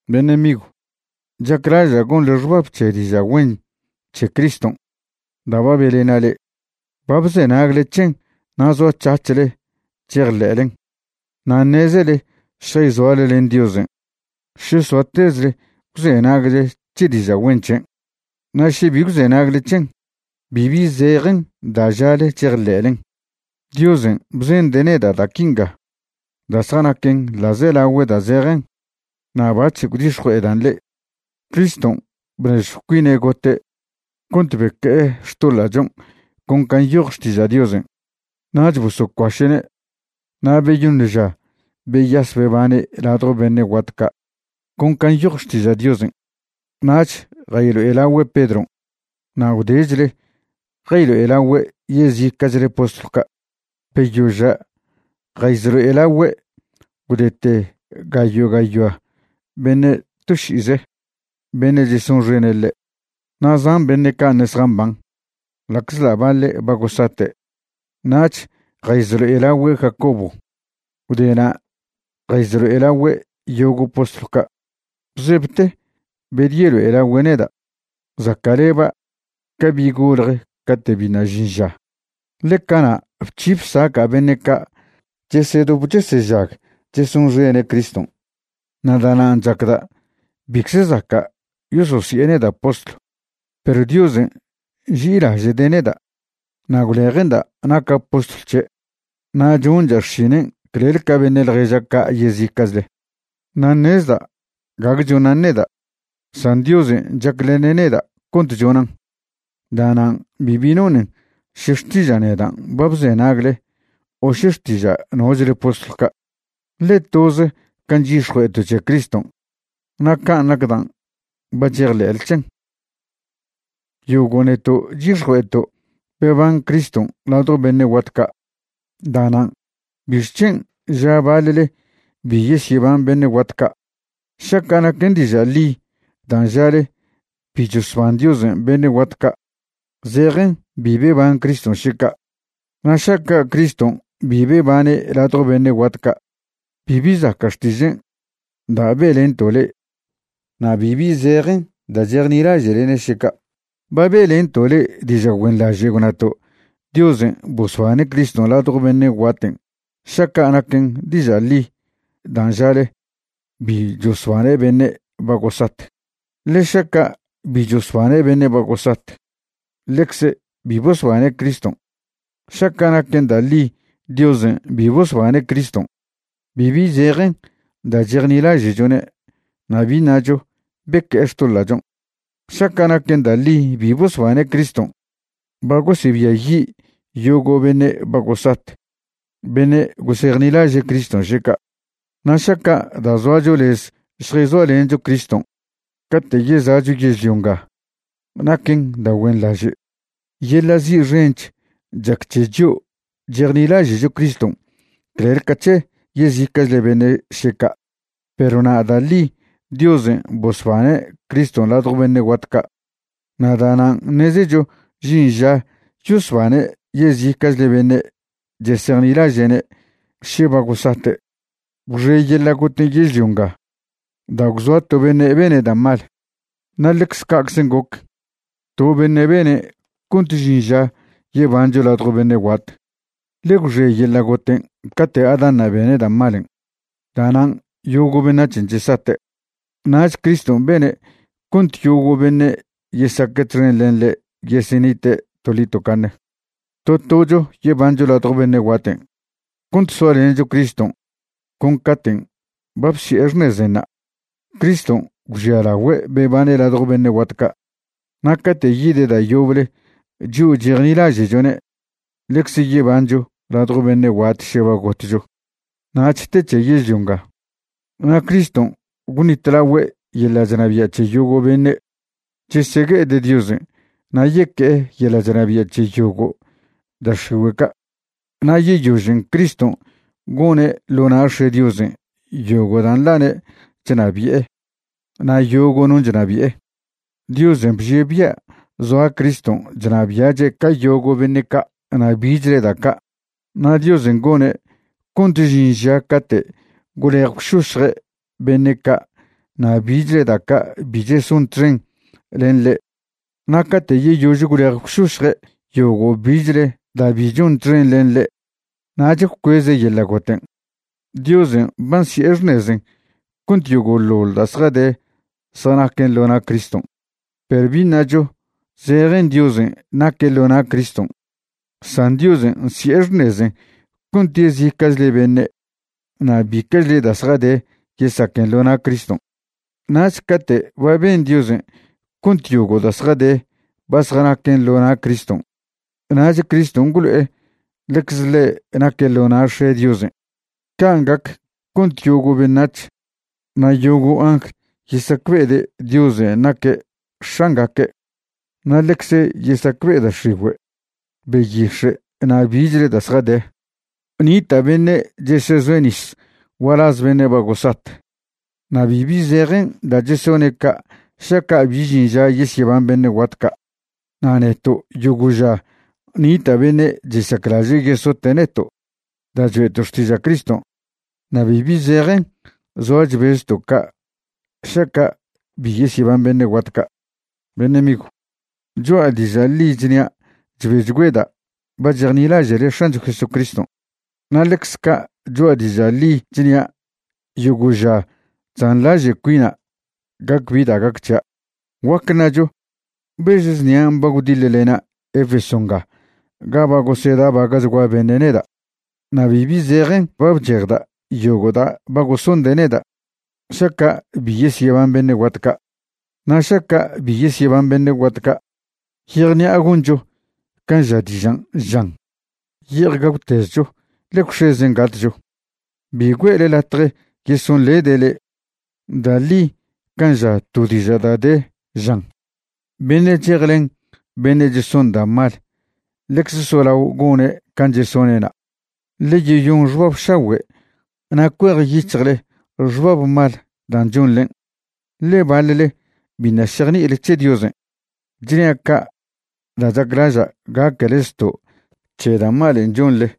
Beṉe' migw, chaclaža' gonḻe xbab c̱he diža' güen c̱he Criston' da' ba be'lena' le'e. Ba bzenagle c̱hen na' zoac̱hac̱hle chejḻe'len. Na' ṉezele šjayzoale len Diosen' še soatezle gwzenagle c̱he diža' güen c̱hen'. Na' še bi gwzenagle c̱hen, bibi zejen da' žale chejḻe'len'. Diosen' bzende' neda' da' quinga da' zjanaquen ḻa'zelagüe' da' zejen na' bac̱h gwdix̱jue'edan' le'e. Criston' bnežjw cuine' gote' cont beque'e xtoḻa'chon' con can' nyoj Xtiža' Diosen'. Nach bosocuaše'ne', na' beyoṉ ža beyas bebane' ladjo beṉe' guat ca' con can' nyoj Xtiža' Diosen'. Nach jaylo'elagüe' Pedron' na' gwdechle jaylo'elagüe' yezica'chle postlw ca'. Beyoža' jayezlo'elagüe' gwdete gayo' gayoa beṉe' to ši'ize, beṉe' chesonxene' ḻe'. Na' zan beṉe' ca' ṉe' zjamban, ḻa'czḻa' baḻe' ba gosate'. Nach jayzlo'elagüe' Jacobo. Gwde na' jayzlo'elagüe' yogo' postlw ca'. Bzebte bedyelo'elagüe' neda', zaca'leba' ca bi' golje cate' biṉa' žin ža, ḻe cana' bc̱hi bsaca' beṉe' ca' chesedop chesežag chesonxene' Criston'. Na' da'nan' chacda' bicze zaca' yososi'e neda' postlw. Perw Diosen' nži'ilaže'de' neda' na' gwleje'nda' naca' postlw c̱he', na' choncha' xšinen' clel ca beṉe' ḻježa' ca' yezica'chle. Na' ṉezda' gague chonan' neda', san Diosen' chaclene' neda' cont chonan'. Da'nan' bibi nonen še xtiža' nedan' ba bzenagle o še xtiža' nochle postlw ca', ḻe toze can' chyix̱jue'eto' c̱he Criston' na' can' nac dan' ba chejḻe'le c̱hen'. Yogo' neto' chyix̱jue'eto' beban Criston' ladjo beṉe' guat ca'. Da'nan' ¿bixc̱hen' ža baḻle bi yesyeban beṉe' guat ca'? Šaca' naquen diža' ḻi dan' žale bi chosban Diosen' beṉe' guat ca', zejen bi beban Criston' še ca'. Na' šaca' Criston' bi bebane' ladjo beṉe' guat ca', bibi zaca' xtižen' da' be'lento' le'e na' bibi zejen da' chejnilaže'lene' še ca'. Ba be'lento' le'e diža' güenḻaže' gwnato' Diosen' bosbane' Criston' ladjo beṉe' guaten' šaca' naquen diža' ḻi dan' žale bi chosbane' beṉe' ba gosat. Ḻe šaca' bi chosbane' beṉe' ba gosat, ḻecze bi bosbane' Criston'. Šaca' naquen da' ḻi Diosen' bi bosbane' Criston', bibi zejen da' chejnilaže'chone' na' bi ṉacho beque'e xtoḻa'chon'. Šaca' naquen da' ḻi bi bosbane' Criston', ba gosebiayi' yogo' beṉe' ba gosat beṉe' gosejnilaže' Criston' še ca'. Na' šaca' da' zoacho lez šjayzoalencho Criston' cate' yeza'cho yežlio nga naquen da' güenḻaže', yeḻa' zi' xench chac c̱he chio' chejni'ilaže'cho Criston' clel ca c̱he yezica'chle beṉe' še ca'. Perw na' da' ḻi Diosen' bosbane' Criston' ladjo beṉe' guat ca', na' da'nan' ṉezecho žin ža yosbane' yezica'chle beṉe' chesejnilaže'ne' še ba gosate'. Gwxe yeḻa' goten' yežlio nga da' gwzoa' to beṉe' bene' da' mal, na' ḻecze ca'czen' goc, to beṉe' bene' cont žin ža yebancho ladjo beṉe' guat. Ḻe gwxe yeḻa' goten' cate' Adanṉa' bene' da' malen', da'nan' yogo' beṉac̱hen' chesate'. Nach Criston' bene' cont yogo' beṉe' yesaque' txen len ḻe' yesenite' toḻi tocaṉe. To tocho yebancho ladjo beṉe' guaten' cont soalencho Criston' con caten' ba bsi'e xṉezenṉa'. Criston' gwžialagüe' bebane' ladjo beṉe' guat ca' na' cate' yide' da' yoble chio' chejnilaže'chone' ḻecze yebancho ladjo beṉe' guat še ba gotcho. Nach te c̱he yežlio nga. Na' Criston' gwṉitlagüe' yeḻa' chnabia' c̱he yogo' beṉe' chesegue'ede' Diosen' na' yeque'e yeḻa' chnabia' c̱he yogo' da' x̱igüe' ca'. Na' yeyožen' Criston' gone' ḻo na' X̱e' Diosen' yogo' da' nḻane' chnabi'e na' yogo' non' chnabi'e. Diosen' bžie' bia' zoa Criston' chnabia'che' ca yogo' beṉe' ca' na' bichle da' ca', na' Diosen' gone' cont žin ža cate' gwlej gwšošje' beṉe' ca' na' bichle da' ca' bi cheson txen len ḻe'. Na' cate' yeyož gwlej gwšošje' yogo' bichle da' bi chon txen len ḻe', nach gwcueze' yeḻa' goten'. Diosen' ba nsi'e xṉezen' cont yogo'ḻoḻ da' zjade zjanaquen ḻo na' Criston'. Perw bi ṉacho zejen Diosen' naque' ḻo na' Criston', san Diosen' nsi'e xṉezen' cont yezica'chle beṉe' na' bica'chle da' zjade yesaquen ḻo na' Criston'. Nach cate' ba ben Diosen' cont yogo' da' zjade ba zjanaquen ḻo na' Criston', nach Criston' gwlo'e ḻecze ḻe' naque' ḻo na' X̱e' Diosen'. Can' gac cont yogo' beṉac̱h na' yogo' angl yesacbe'ede' Diosen' naque' X̱angaque', na' ḻecze yesacbe'e da' x̱igüe', beyix̱e' na' bichle da' zjade. Nita' beṉe' chesezoe' nis gualaz beṉe' ba gosat. Na' bibi zejen da' chesone' ca' šaca' bi žin ža yesyeban beṉe' guat ca'. Na' neto' yogo' ža nita' beṉe' chesaclaže' yesote' neto' da' choe'to' xtiža' Criston', na' bibi zejen zoa chbezto' ca' šaca' bi yesyeban beṉe' guat ca'. Beṉe' migw, choa' diža' ḻi chnia' chbechgüeda' ba chejnilaže'le X̱ancho Jesucriston', na' ḻecze ca' choa' diža' ḻi chnia' yogo' ža chzanḻaže' cuina' gac bi da' gac c̱hia'. Guac ṉacho bež znia ba gwdiḻlena' Efeso nga ga ba gosedabaga'chgua beṉe' neda'. Na' bibi zejen ba bchejda' yogo' da' ba gosonde' neda' šaca' bi yesyeban beṉe' guat ca'. Na' šaca' bi yesyeban beṉe' guat ca', yejṉi'a goncho can' ža dižan' žan: “Ye'ej gagwtezcho, ḻe gwx̱ezen' gatcho.” Bi güe'le latje yesonḻede' le'e. Da' ḻi can' ža to diža' da' de, žan: “Beṉe' chejlen beṉe' cheson da' mal ḻecze solao gone' can' chesone'na'.” Ḻe yeyon xbab šagüe' na' cuejyic̱hjle xbab mal dan' chonḻen', ḻe baḻle biṉa' šejni'ile c̱he Diosen'. Chnia' ca' da' chaclaža' gaquele zto' c̱he da' malen' chonḻe.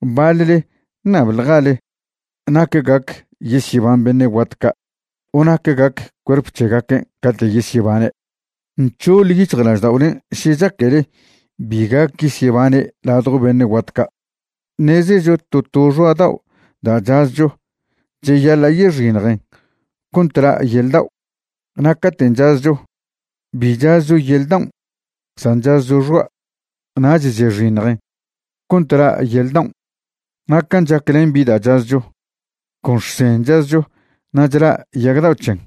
Baḻle ṉabḻjale nac gac yesyeban beṉe' guat ca' o nac gac cuerp c̱hegaquen' cate' yesyebane'. Nc̱hoḻ yic̱hjlažda'olen' še chaquele bi gac yesyebane' ladjo beṉe' guat ca'. Ṉezecho to to xoa' dao' da' chazcho cheyaḻa' yexiṉjen cont la' yel dao'. Na' caten' chazcho, bi chazcho yel daon', san chazcho xoa', nach chexiṉjen cont la' yel daon'. Na' can' chac len bi da' chazcho, con xsen' chazcho na' chla' yag dao' c̱hen.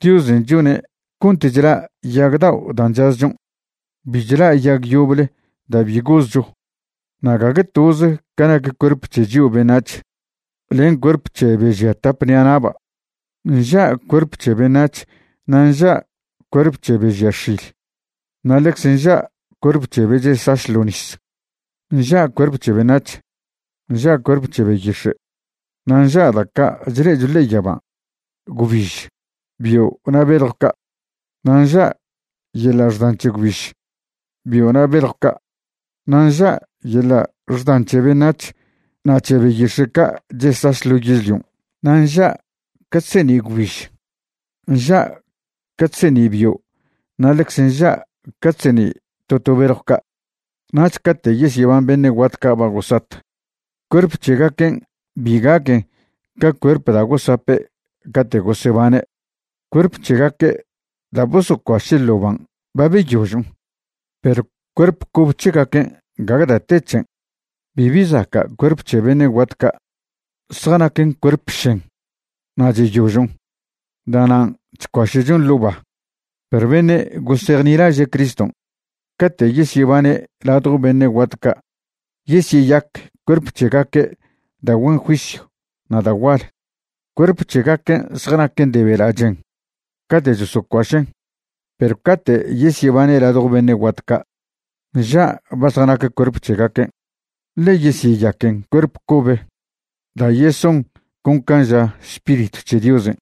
Diosen' chone' cont chla' yag dao' dan' chazchon', bi chla' yag yoble da' bi gozcho. Na' gague toze ca nac cuerp c̱he chio' beṉac̱h len cuerp c̱he be žia tap ṉi'a na'ba'. Nža' cuerp c̱he beṉac̱h na' nža' cuerp c̱he be žia x̱il, na' ḻecze nža' cuerp c̱he be chesaš ḻo' nis. Nža' cuerp c̱he beṉac̱h, nža' cuerp c̱he beyix̱e', na' nža' da' ca' chle'echo ḻe'e yaban', gwbiž, bio' na' beljw ca'. Na' nža' yeḻa' xdan c̱he gwbiž, bio' na' beljw ca', na' nža' yeḻa' xdan c̱he beṉac̱h na' c̱he beyix̱e' ca' chesaš ḻo yežlion'. Na' nža' ca chseṉi' gwbiž, nža' ca chseṉi' bio' na' ḻecze nža' ca chseṉi' to to beljw ca'. Nach cate' yesyeban beṉe' ca' ba gosat, cuerp c̱hegaquen' bi gaquen ca cuerp da' gosape' cate' gosebane'. Cuerp c̱hegaque' da' bosocuaše' ḻo' ban' ba beyožon', perw cuerp cobe c̱hegaquen' gague da' te c̱hen. Bibi zaca' cuerp c̱he beṉe' guat ca', zjanaquen cuerp šen, na' cheyožon', da'nan' chcuaše'chon ḻo' ba. Perw beṉe' gosejnilaže' Criston', cate' yesyebane' ladjo beṉe' guat ca' yesyeyac cuerp c̱hegaque' da' güen juisyw na' da' gual. Cuerp c̱hegaquen' zjanaquen de bela' chen cate' chosocuašen' perw cate' yesyebane' ladjo beṉe' guat ca' nža' ba zjanac cuerp c̱hegaquen', ḻe yesyeyaquen cuerp cobe da' yeson con can' ža Spiritw c̱he Diosen'.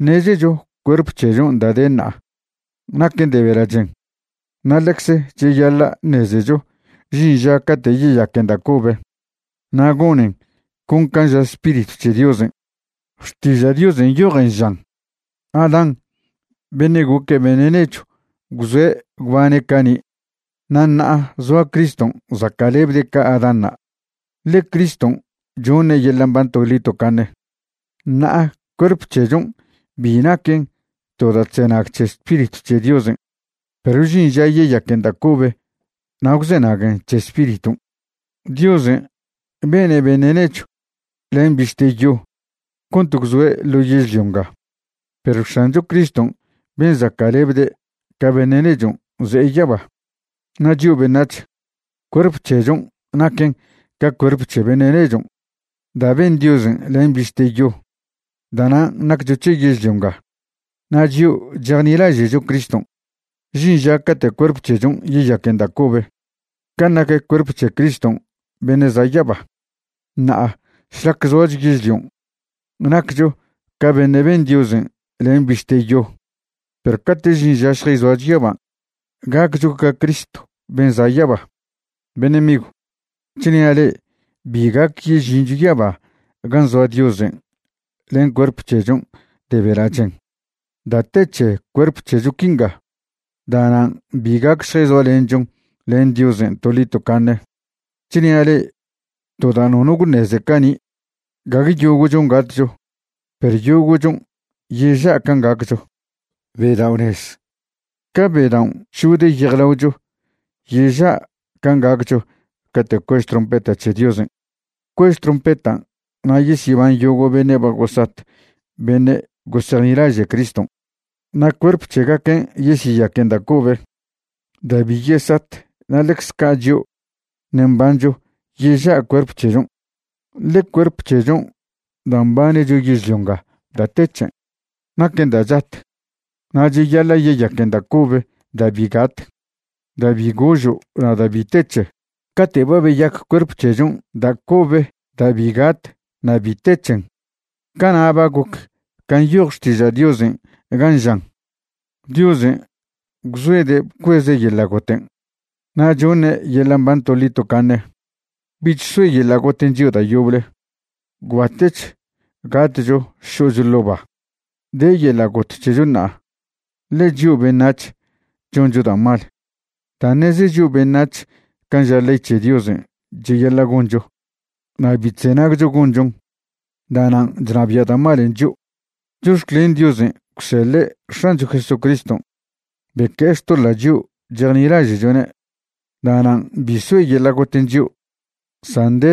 Ṉezecho cuerp c̱hechon' da' de ṉa'a naquen de bela' chen, na' ḻecze cheyaḻa' ṉezecho žin ža cate' yeyaquen da' cobe na' gonen con can' ža Spiritw c̱he Diosen'. Xtiža' Diosen' nyojen žan Adán beṉe' goc beṉe' nechw gwzoe' gwbane' cani'. Na' ṉa'a zoa Criston' zaca'lebde' ca Adánṉa', ḻe Criston' choṉe' yeḻa' mban toḻi tocaṉe. Ṉa'a cuerp c̱hechon' bi naquen to da' chzenag c̱he Spiritw c̱he Diosen', perw žin ža yeyaquen da' cobe na' gwzenaguen c̱he Spiriton'. Diosen' bene' beṉe' nechw len bište yo cont gwzoe' ḻo yežlio nga, perw X̱ancho Criston' ben' zaca'lebde' ca beṉe' nechon' ze'e yaba. Na' chio' beṉac̱h, cuerp c̱hechon' naquen ca cuerp c̱he beṉe' nechon' da' ben Diosen' len bište yo, da'nan' naccho c̱he yežlio nga. Na' chio' chejnilaže'cho Criston', žin ža cate' cuerp c̱hechon' yayaquen da' cobe can' nac cuerp c̱he Criston' beṉe' za' yaba. Ṉa'a šlac zoacho yežlion' naccho ca beṉe' ben Diosen' len bište yo, perw cate' žin ža šjayzoacho yaban', gaccho ca Cristo ben' za' yaba. Beṉe' migw, chnia' le'e bi gac yežincho yaba gan' zoa Diosen' len cuerp c̱hechon' de bela' chen. Da' te c̱he cuerp c̱hecho quinga, da'nan' bi gac šjayzoalenchon len Diosen' toḻi tocaṉe. Chnia' le'e to da' nono gwṉeze cani', gague yogo'chon' gatcho, perw yogo'chon' yeža' can' gaccho. Bedao'ṉez, ca bedaon' chžode' yejlaochon', yeža' can' gaccho cate' cuež trompeta c̱he Diosen'. Cuež trompetan' na' yesyeban yogo' beṉe' ba gosat beṉe' gosejnilaže' Criston'. Na' cuerp c̱hegaquen' yesyeyaquen da' cobe da' bi yesat na' ḻecze ca' chio' ṉe' mbancho yeža' cuerp c̱hechon'. Ḻe cuerp c̱hechon' da' mbanecho yežlio nga da' te c̱hen. Naquen da' chat, na' cheyaḻa' yayaquen da' cobe da' bi gat, da' bi gožo' na' da' bi te c̱he. Cate' ba beyac cuerp c̱hechon' da' cobe da' bi gat na' bi te c̱hen, cana' ba goc can' nyoj Xtiža' Diosen' gan' žan: “Diosen' gwzoede' bcueze' yeḻa' goten', na' choṉe' yeḻa' mban toḻi tocaṉe. Bich soe yeḻa' goten' chio' da' yoble. Gwbatech gatcho šo'cho ḻo' ba.” De yeḻa' got c̱hecho ṉa'a ḻe chio' beṉac̱h choncho da' mal. Da' ṉeze chio' beṉac̱h can' ža ley c̱he Diosen' cheyaḻa' goncho na' bi chzenagcho gonchon, da'nan' chnabia' da' malen' chio'. Chox̱clen Diosen' gwseḻe' X̱ancho Jesucriston' beque'e xtoḻa' chio' chejnilaže'chone'. Da'nan' bi soe yeḻa' goten' chio', san de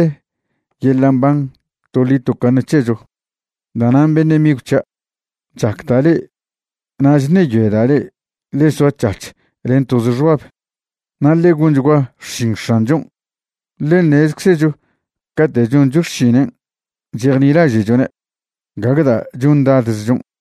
yeḻa' mban toḻi tocaṉe c̱hecho. Da'nan' beṉe' migw c̱hia', chacda' le'e na' chṉeyoeda' le'e ḻe soac̱hac̱h len toze xbab. Na' ḻe gonchgua xšin X̱anchon', ḻe ṉezczecho cate' choncho xšinen' chejnilaže'chone', gague da' chondadzchon'.